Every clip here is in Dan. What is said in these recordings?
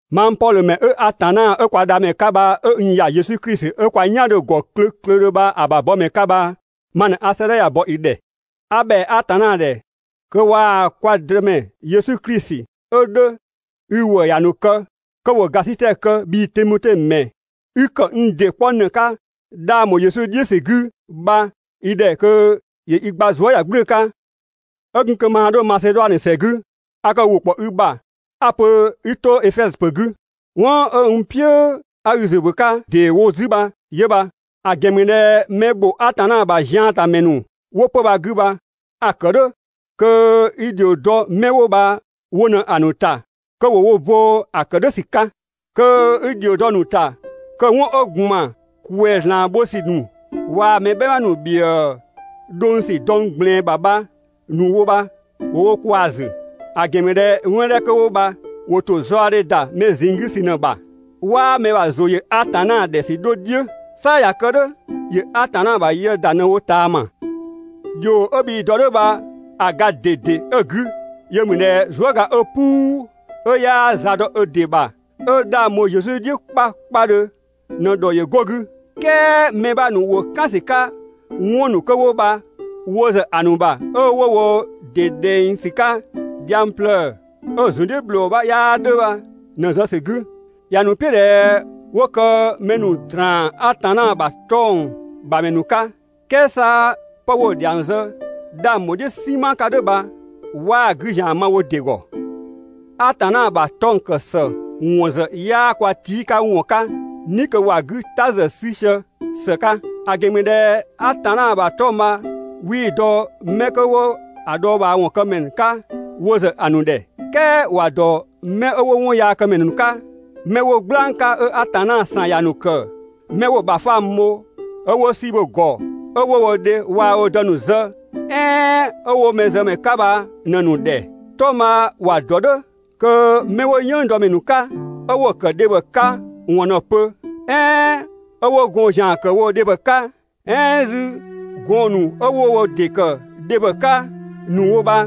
Mang Pɔdhö ‑mɛ 'ö Atanna 'ö kwa Dhamɛ 'ka bha 'ö n ‑ya Yesu Klisi 'ö kwa "yan 'dhö‑ ‑gɔ klöklödhö bha‑ ‑bha bɔmɛ 'ka bha ma ꞊në 'a 'sëëdhɛ ya‑ bɔ i ‑dhɛ. A ‑bhɛa Atanna ‑dhɛ kö waa‑ kwa Dëmɛ Yesu Klisi 'ö 'dhö i ‑wëë ‑ya ‑nu kë, kö ‑wo ‑gasitɛ kë bhii Timote ‑mɛ 'i ‑kë n ‑dɩ 'kpɔ ‑në 'ka 'dhang ‑bho Yesu "dhiʋ̈ ‑sü 'gü bha i ‑dhɛ kö ‑wo i ‑gba zuëyagblʋ̈ʋ̈‑ 'ka. 'Ö gun kö maa 'dho Maseduanö ‑sɛ 'gü, a kë ‑wʋ ‑kpɔ i ‑bha 'a‑ pö 'i 'to Efɛzö ‑pö 'gü. 'Wɔn 'ö n "piʋ̈ 'a i ‑zʋ ‑bö 'ka ‑deewo 'zü bha 'yö bha. ‑A ‑gɛn ‑mü ꞊dhɛ mɛ ‑bho Atanna ‑bha ziantamɛ ‑nu ‑wo 'pö‑ bha‑ 'gü. A‑ kë "dhʋ̈ kö i ‑dhio dɔ 'mɛ 'wo bha wo ꞊në‑ ‑nu ‑ta kö ‑wo wo bo‑ ‑kë "dhʋ̈ ‑sü 'ka. Kö 'i ‑dhio dɔ‑ ‑nu ‑ta kö 'wɔn 'ö ‑gban ‑kwɛzlan bho ‑sü ‑nu, waa‑ mɛ "bhɛma ‑nu ‑bhiëë dhʋng ‑sü dɔng ꞊gblɛɛn bha‑ ‑bha ‑nu wo bha ‑wo wo kwaa‑ ‑zü. ‑A ‑gɛn ‑mü ꞊dhɛ 'wɔn 'dhɛ ‑nu 'kö 'wo bha ‑wo ‑to zaɔdhe ‑da mɛ ꞊zinng 'gü ‑sü ꞊në‑ ‑bha. 'Waa mɛ ‑bha ‑zʋ ‑yö Atanna ‑dhɛ ‑sü 'dho "dhiʋ̈. 'Sa ꞊ya kë "dhʋ̈ ‑yö Atanna ‑bha yë ‑da ꞊në‑ wo ꞊taama. ‑Dhio 'ö bhii‑ dɔ "dhʋ̈ bha‑ ga ꞊dede 'ö‑ 'gü 'yö ‑mü ꞊dhɛ zuëga 'ö "puu, 'ö 'yaa za dɔ ö ‑dɩ bha, 'ö 'dhang bho Yesu "dhiʋ̈ 'kpakpadhö ꞊në ‑dhɔ ‑yö go‑ 'gü. "Kɛɛ mɛ 'bha ‑nu ‑wo "kan ‑sü 'ka 'wɔn ‑nu 'kö 'wo bha wo ‑zë ‑a ‑nu ‑bha 'ö 'wo wo ‑dɩ ꞊dhɛng ‑sü 'ka dhiang plëë‑, 'ö‑ ‑zun "dhiʋ̈ ‑bhlɔɔ 'bha 'yaa 'dhö bha ꞊në‑ zë ‑sü 'gü. ‑Ya ‑nu "piʋ̈ ꞊dhɛ 'wo kë mɛ ‑nu ‑draan Atanna ‑bha 'tɔng‑ ‑bha ‑mɛ ‑nu 'ka, "kɛɛ 'sa 'pë 'wo‑ ‑dhiang zë 'dhang bho "dhiʋ̈ "sinma 'ka "dhʋ̈ bha 'waa‑ 'gü ‑zian ma wo ‑dɩ ‑gɔ. Atanna ‑bha 'tɔng‑ ‑kë ‑së ‑wɔn ‑zë 'yaa kwa tii' 'ka ‑wɔn 'ka "ni kö ‑wa 'gü "ta ‑zë 'sü sië ‑së 'ka. ‑A ‑gɛn ‑mü ꞊dhɛ Atanna ‑bha 'tɔng‑ bha 'wii‑ dɔ 'mɛ 'kö 'wo‑ dhɔɔbhaawɔn këmɛ 'ka wo ‑zë ‑a ‑nu ‑dhɛ. "Kɛɛ ‑wa ‑dɔ 'mɛ 'wo 'wɔnyaakëmɛ ‑nu 'ka, 'mɛ 'wo "gblang 'ka 'ö Atanna ‑san ‑ya ‑nu ‑kë, 'mɛ 'wo‑ ‑bha fangbho, 'ö 'wo "si bho‑ ‑gɔ, 'ö 'wo wo dhe waa‑ wo dë ‑nu zë, "ɛɛn 'ö 'wo mɛzëmɛ 'ka bha ꞊në‑ ‑nu ‑dhɛ. 'Tɔng‑ bha ‑wa ‑dɔ "dhʋ̈ kö 'mɛ 'wo "yënngdɔmɛ ‑nu 'ka, 'ö 'wo‑ ‑kë dhebhɔ 'ka ‑wɔn ꞊në‑ pö, "ɛɛn 'ö 'wo gɔɔn‑ ‑zian ‑kë woo‑ dhebhɔ 'ka, "ɛɛn 'zü gɔɔn‑ ‑nu 'ö 'wo wo ‑dɩ ‑kë dhebhɔ 'ka ‑nu wo bha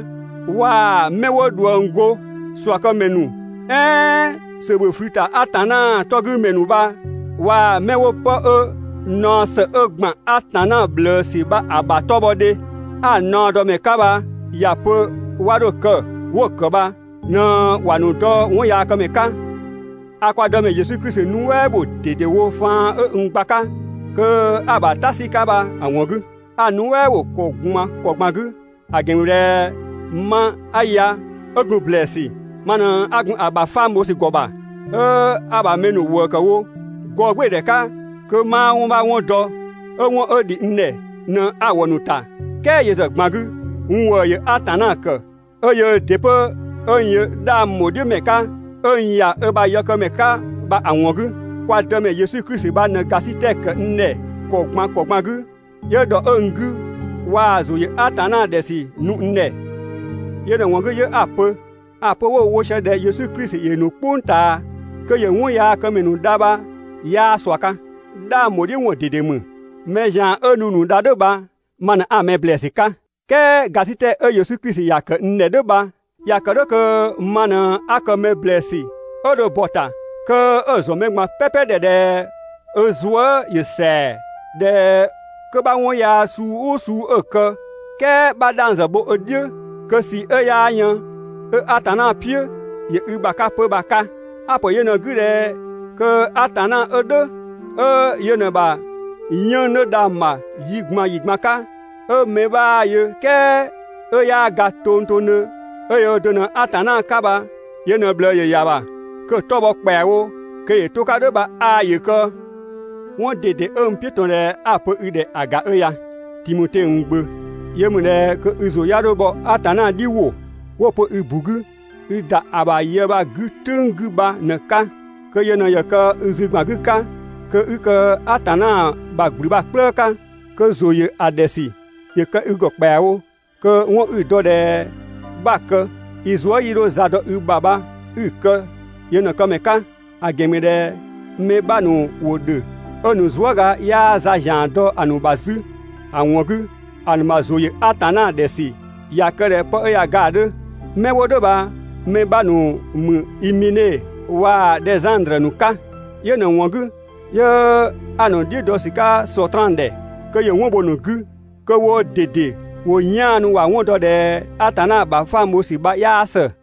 waa‑ 'mɛ 'wo ꞊dhuëng go, ꞊suakëmɛ ‑nu "ɛɛn ‑sö ‑bhö ꞊flü ‑ta Atanna 'tɔ 'gü ‑mɛ ‑nu bha waa‑ 'mɛ 'wo 'pë 'ö naɔ ‑së 'ö ‑gban Atanna ꞊bhlëësü bha‑ ‑bha 'tɔbhɔdhe, 'a‑ ‑naɔdɔmɛ 'ka bha ‑ya pö 'wa 'dho‑ kë, 'wo‑ ‑kë bha ꞊në ‑wa ‑nu dɔ 'wɔnyaakëmɛ 'ka. A kwa Dëmɛ Yesu Klisi nuɛ" ‑bho ꞊dedewo faan 'ö n gba‑ 'ka kö 'a‑ ‑bha "ta 'sü‑ 'ka bha‑ ‑wɔn 'gü. A‑ nuɛ" bho ‑kɔ ꞊gban ‑kɔ ꞊gban 'gü, ‑a ‑gɛn ‑mü ꞊dhɛ ma 'a ya 'ö gun ‑blɛɛsü, ma ꞊në 'a gun‑ ‑bha fangbho ‑sü ‑gɔ ‑bha, 'ö 'a‑ ‑bha mɛ ‑nu ‑wëë ‑kë wo, gɔɔgbɩɩdhɛ 'ka kö 'maa 'wɔn 'bha 'wɔn dɔ, 'ö 'wɔn 'ö ‑dhi n ‑dhɛ ꞊në 'a‑ ‑wɔ ‑nu ‑ta, "kɛɛ yö ‑zë ꞊gban 'gü 'ö n ‑wëë ‑yö Atanna ‑kë, 'ö yöö ‑dɩ 'pö 'ö n yö 'dhang ‑bho "dhiʋ̈ ‑mɛ 'ka 'ö n ‑ya ö ‑bha yëkëmɛ 'ka bha‑ ‑wɔn 'gü. Kwa Dëmɛ Yesu Klisi bha ꞊në ‑gasitɛ ‑kë n ‑dhɛ ‑kɔ ꞊gban ‑kɔ ꞊gban 'gü, 'yö ‑dhɔ 'ö‑ 'gü waa‑ ‑zʋ ‑yö Atanna ‑dhɛ ‑sü nu n ‑dhɛ. Yö ꞊në‑ ‑wɔn 'gü 'yö 'a‑ pö, ‑a pö 'wo‑ wo ꞊sië ꞊dhɛ Yesu Klisi ‑yö ‑nu "kpʋng ꞊taa kö ‑yö 'wɔnyaakëmɛ ‑nu dha bha 'yaa ꞊sua 'ka. 'Dhang ‑bho "dhiʋ̈ ‑wɔn ꞊dede ‑mü. Mɛ ‑zian 'ö nu‑ ‑nu dha "dhʋ̈ bha ma ꞊në 'a‑ mɛ ‑blɛɛsü 'ka. "Kɛɛ ‑gasitɛ 'ö Yesu Klisi ‑ya ‑kë n ‑dhɛ "dhʋ̈ bha ‑ya ‑kë "dhʋ̈ kö ma ꞊në 'a kë mɛ ‑blɛɛsü 'ö dho bɔ‑ ‑ta kö 'ö‑ ‑zɔn mɛ ꞊gban "pɛpɛ ‑dhɛ ꞊dhɛ ö zuë" ‑yö ‑sɛa, ꞊dhɛ 'kö 'bha 'wɔn yaa suu "ʋʋ suu 'ö‑ kë, "kɛɛ 'bha 'dhang ‑zë bho ö "dhiʋ̈, kö ꞊sii 'ö 'yaa yën 'ö Atanna "piʋ̈ ‑yö i ‑bha 'ka 'pö bha‑ 'ka. A‑ ‑pö yö ꞊në‑ 'gü ꞊dhɛ kö Atanna 'ö "dhʋ̈, 'ö yö ꞊në‑ ‑bha 'yënng‑ 'dhö dhang‑ ‑bha yi ꞊gban ‑yi ꞊gban 'ka, 'ö mɛ 'bhaa‑ yö "kɛɛ 'ö 'yaa ga tongtongdhö, 'ö yöö do ꞊në Atanna 'ka bha yö ꞊në ꞊bhlëë ‑yö ‑ya ‑bha, kö‑ 'tɔ‑ bhɔ ‑kpɛawo kö ‑yö 'to‑ 'ka "dhʋ̈ bha 'aa ‑yö kë. 'Wɔn ꞊dede 'ö n "piʋ̈ ꞊tɔn ꞊dhɛ 'a‑ pö i ‑dhɛ ‑a ‑ga 'ö ya, Timote, n gbö. Yö ‑mü ꞊dhɛ kö i ‑zʋ 'ya 'dho bhɔ Atanna "dhi ‑wʋ 'wo‑ pö i ‑bu 'gü (i ‑da ‑a ‑bha yë bha‑ 'gü "tʋ̈ng 'gü) bha ꞊në‑ 'ka. Kö yö ꞊në ‑yö kë i zü ‑gban 'gü 'ka kö 'i kë Atanna ‑bha ‑gblü bha‑ "kplëë 'ka, kö ‑zʋ ‑yö ‑a ‑dhɛ ‑sü ‑yö kë i ‑gɔ ‑kpɛawo, kö 'wɔn 'i‑ dɔ ꞊dhɛ 'bha‑ kë i zuë" 'yii 'dho za dɔ i ‑bha bha 'i kë yö ꞊në‑ këmɛ 'ka. ‑A ‑gɛn ‑mü ꞊dhɛ mɛ 'bha ‑nu ‑wo ‑dhö 'ö‑ ‑nu zuëga 'yaa za ‑zian dɔ‑ ‑nu ‑bha 'zü. ‑A ‑wɔn 'gü, ‑a ‑nu ‑bha ‑zʋ ‑yö Atanna ‑dhɛ ‑sü ꞊ya kë ꞊dhɛ 'pë ꞊ya ga ‑a 'dhö. 'Mɛ 'wo "dhʋ̈ bha‑ mɛ 'bha ‑nu ‑mü Imene waa‑ Dhɛzandrö ‑nu 'ka. Yö ꞊në‑ ‑wɔn 'gü 'yö 'a‑ ‑nu "dhiʋ̈ dɔ ‑sü 'ka Sɔtraan ‑dhɛ, kö ‑yö 'wɔn bho‑ ‑nu 'gü, kö woo ꞊dede ‑wo 'yaanu ‑wa 'wɔn dɔ ꞊dhɛ Atanna ‑bhafang bho ‑sü bha 'yaa ‑së.